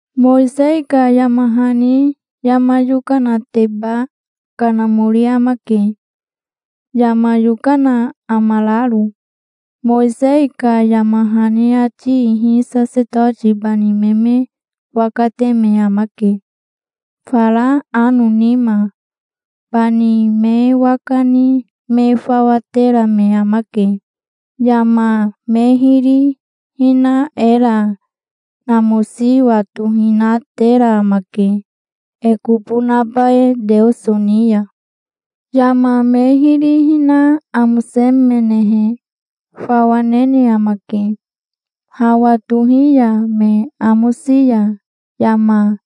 Mowisei ka yama hani yama yokanateba kanamori amake, yama yokana amararo. Mowisei ka yama hani ati ihi Sasetoti bani me me waka te me amake fara ano nima. Bani me waka ni me fawa tera me amake. Yama me hiri hina era namosi watohinatera amake e kobo naba e Teoso ni ya. Yama me hiri hina amosemenehe, fawa nene amake, hawa tohi ya. Me amosi ya yama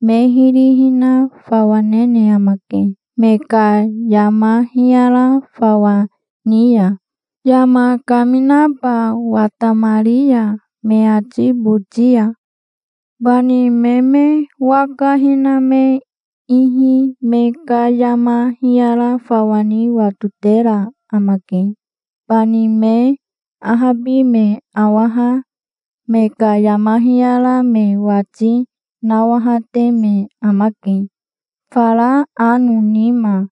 me hiri hina fawa nene amake, me ka yama hiyara fawa ni ya, yama kaminaba watamari ya me ati boti ya. Bani me me waka hina me ihi me ka yama hiyara fawa ni watotera amake. Bani me ahabi me awaha me ka yama hiyara me wati nawahate me amake, fara ano nima.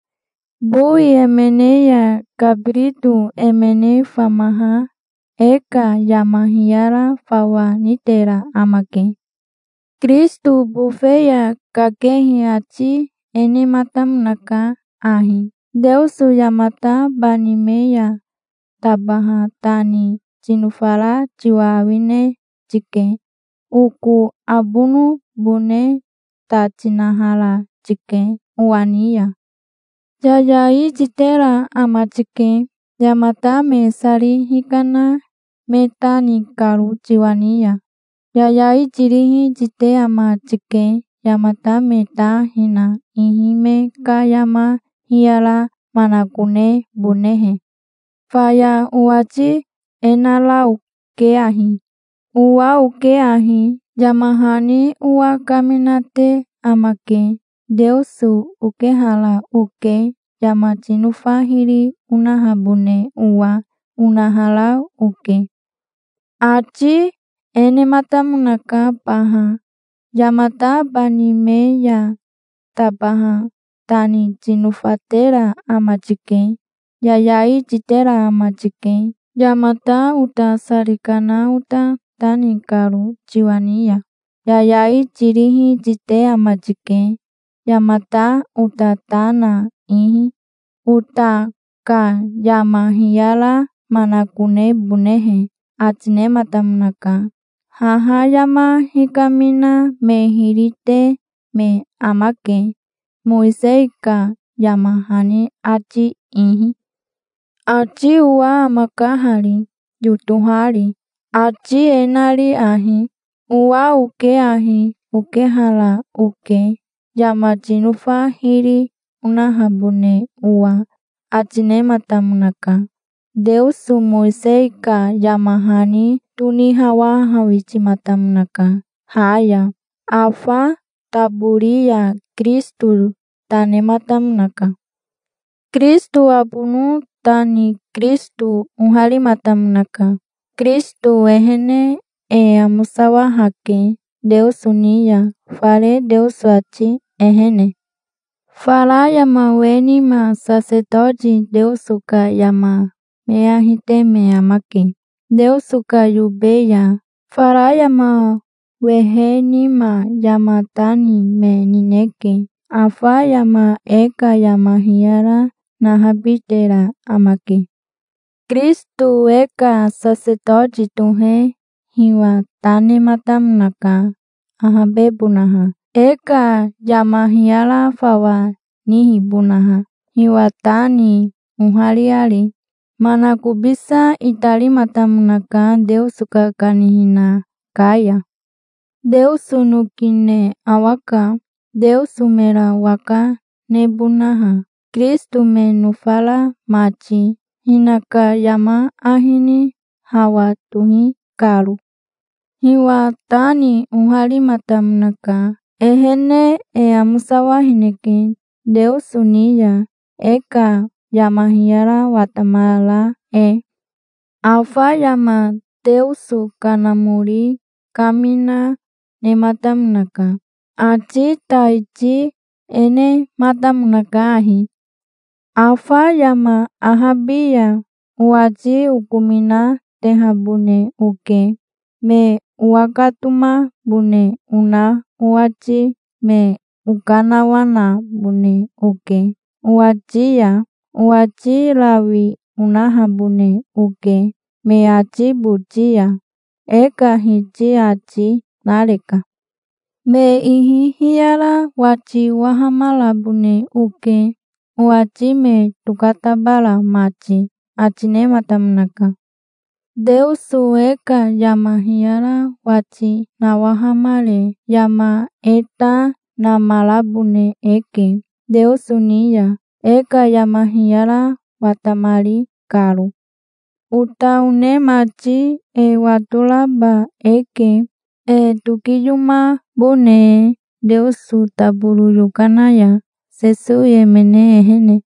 Bowi emene ya kabirito emene famaha e ka yama hiyara fawa nitera amake. Kirisito bofe ya kakehi ati e nematamonaka ahi: "Teoso yamata bani me ya tabaha ta ni tinofara tiwa awine tike. Oko abonobone ta tinahara tike owa ni ya. Yayai titera ama tike, yamata me sari hikana me ta ni karo tiwa ni ya. Yayai tirihi tite ama tike, yamata me ta hina ihi, me ka yama hiyara manakonebonehe. Faya owati e nara oke ahi: 'Owa oke ahi. Yama hani owa kaminate amake. Teoso okehara oke, yama tinofa hiri onahabone owa', onahara oke". Ati e nematamonaka baha: "Yamata bani me ya tabaha ta ni tinofatera ama tike. Yayai titera ama tike, yamata ota sari kana ota ta ni karo tiwa ni ya. Yayai tirihi tite ama tike, yamata ota ta na ihi, ota ka yama hiyara manakonebonehe", ati nematamonaka. Haha yama hikamina me hiri te me amake, Mowisei ka yama hani ati ihi. Ati owa amaka hari, yotohari, ati e nari ahi: "Owa oke ahi. Okehara oke, yama tinofa hiri onahabone owa", ati nematamonaka. Teoso Mowisei ka yama hani tonihawahawitimatamonaka ha ya. Afa tabori ya Kirisito ta nematamonaka. Kirisito abono ta ni Kirisito oharimatamonaka. Kirisito ehene e amosawahake Teoso ni ya, fare Teoso ati ehene. Fara yama we nima sasetoti Teoso ka yama me ahi te me amake Teoso ka yobe ya. Fara yama wehe nima yama ta ni me nineke. Afa yama e ka yama hiyara nahabitera amake. Kirisito e ka sasetoti tohe hiwa ta nematamonaka ahabebonaha, e ka yama hiyara fawa nihibonaha, hiwa ta ni ohariari. Manakobisa itarimatamonaka Teoso ka kanihina ka ya. Teoso noki ne awaka, Teoso mera waka nebonaha, Kirisito me nofara mati, hinaka yama ahi ni hawa tohi karo. Hiwa ta ni oharimatamonaka. Ehene e amosawahineke Teoso ni ya, e ka yama hiyara watamara e. Afa yama Teoso Kanamori kamina nematamonaka. Ati taiti e nematamonaka ahi: Afa yama ahabi ya, owati okominatehabone oke, me owakatomabone ona owati. Me okanawanabone oke owati ya. Owati rawi onahabone oke me ati boti ya, e ka Hiti ati nareka. Me ihi hiyara wati owahamarabone oke, owati me tokatabara mati, ati nematamonaka. Teoso e ka yama hiyara wati nawahamare yama e ta namarabone eke Teoso ni ya, e ka yama hiyara watamari karo. Ota one mati, e watoraba eke, e tokiyomabone e Teoso taboro yokana ya, Sesowi emene ehene.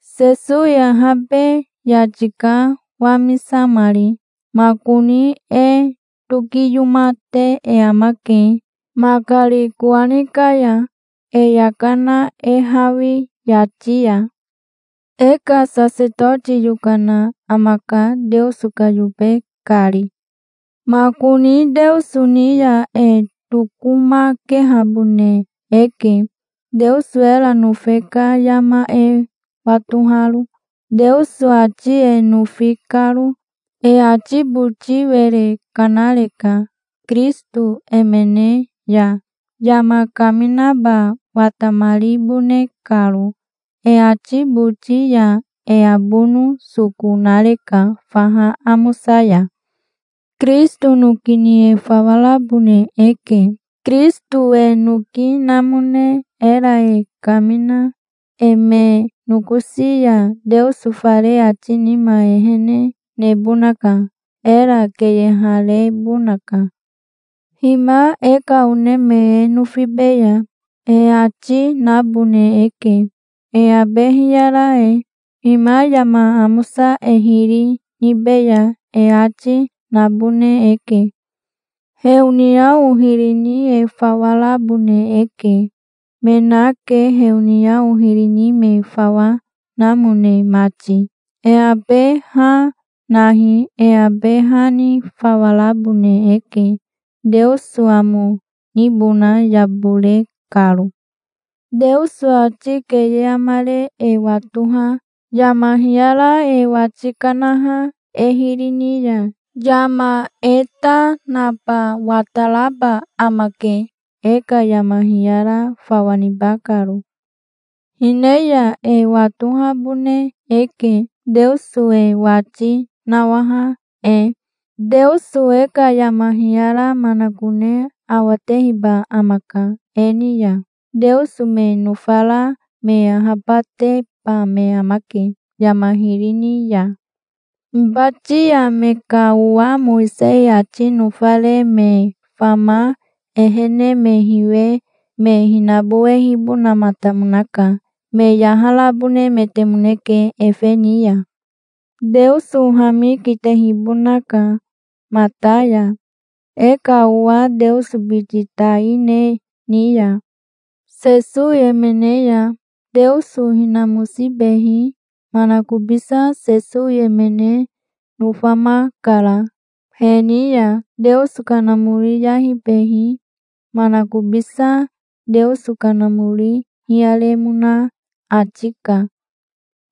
Sesowi ahabe yati ka, wamisamari. Makoni e tokiyomate e amake makari kowani ka ya, e yaka na e hawi yati ya. E ka sasetoti yokana amaka, Teoso ka yobe kari. Makoni Teoso ni ya e tokomakehabone eke, Teoso era nofe ka yama e watoharo, Teoso ati e nofi karo. E ati boti were kanareka, Kirisito emene ya, yama kaminaba watamaribone karo e ati boti ya. E abono soko nareka faha amosa ya. Kirisito noki ni e fawa rabone e ke, Kirisito e noki namone era e kamina e me nokosi ya. Teoso fare ati nima ehene nebonaka. Era keyeharebonaka. "Hima e ka one me e nofibeya", e ati nabone eke, e abe hiyara e. "Hima yama amosa e hiri nibeya", e ati, nabone eke. Heoniao hiri ni e fawa rabone eke. Me nake, heoniao hiri ni me fawa namone mati. E abe ha nahi. E abe ha ni fawa rabone eke, Teoso amo nibona yabore karo. Teoso ati keye amare e watoha, yama hiyara e wati kanaha e hiri ni ya, yama e ta naba wataraba amake, e ka yama hiyara fawa niba karo. Hine ya e watohabone eke, Teoso e wati nawaha e. Teoso e ka yama hiyara manakone awatehiba amaka e ni ya. Teoso me nofara me ahabateba me amake yama hiri ni ya. Hibati ya me ka owa Mowisei ati nofare me fama ehene me hiwe me hinabowehibonamatamonaka. Me yaharabonemetemoneke efe ni ya. Teoso hami kitehibonaka mata ya, e ka owa Teoso biti tai ne ni ya. Sesowi emene ya Teoso hinamosibehi manakobisa Sesowi emene nofamakara. He ni ya Teoso Kanamori yahibehi manakobisa Teoso Kanamori hiyaremona ati ka.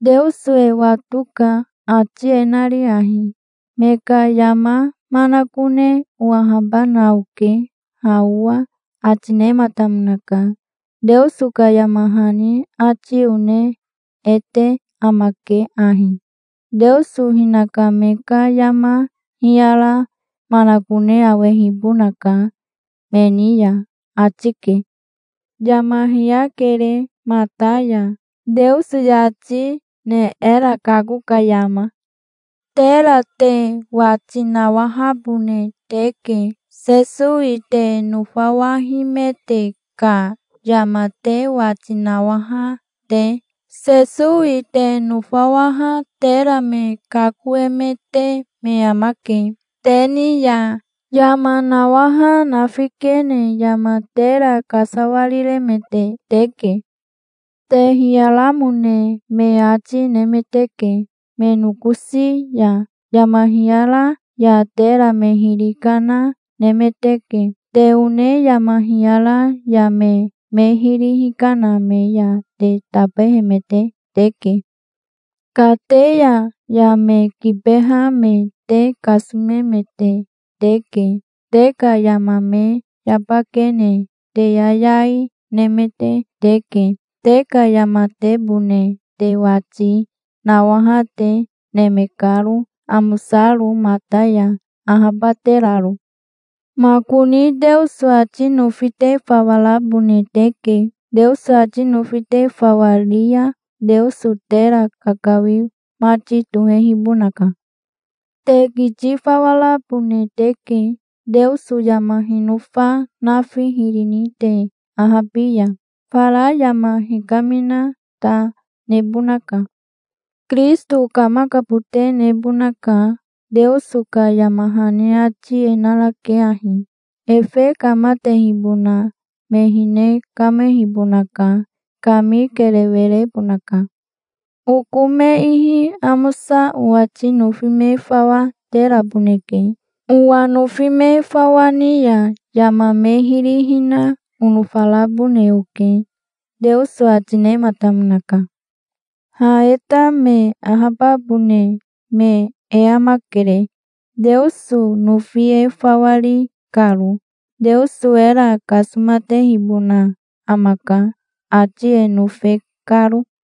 Teoso e watoka, ati e nari ahi: "Me ka yama manakone owahabana oke ha owa", ati nematamonaka. Teoso ka yama hani ati one e te amake ahi: "Teoso hinaka me ka yama hiyara manakone awehibonaka me ni ya", ati ke. Yama hiyakere mata ya, Teoso yati ne era kako ka yama. Tera te wati nawahabone teke, Sesowi te nofawahimete ka yama te wati nawaha te. Sesowi te nofawaha tera me kakoemete me amake. Te ni ya yama nawaha nafikene yama tera kasawariremete teke. Te hiyaramone me ati nemeteke me nokosi ya. Yama hiyara ya tera me hiri kana nemeteke. Te one yama hiyara ya me me hiri hikana me ya te tabehemete teke. Kateya ya me kibeha me te kasomemete teke. Te ka yama me yabakene te yayai nemete teke, te ka yamatebone te wati nawaha te, neme karo, amosaro mata ya, ahabateraro. Makoni Teoso ati nofi te fawa rabone teke. Teoso ati nofi te fawa ri ya, Teoso tera kakawi mati tohehibonaka. Te kiti fawa rabone teke. Teoso yama hinofa nafi hiri ni te ahabi ya, fara yama hikamina ta nebonaka. Kirisito kamakabote nebonaka. Teoso ka yama hani ati e narake ahi: "Efe kamatehibona me hine kamehibonaka. Kami kerewe rebonaka. Oko me ihi amosa owati nofi me fawa teraboneke. Owa nofi me fawa ni ya yama me hiri hina onofarabone oke", Teoso ati nematamonaka. Ha e ta me ahababone me e amakere, Teoso nofi e fawa ri karo. Teoso era kasomatehibona amaka, ati e nofe karo.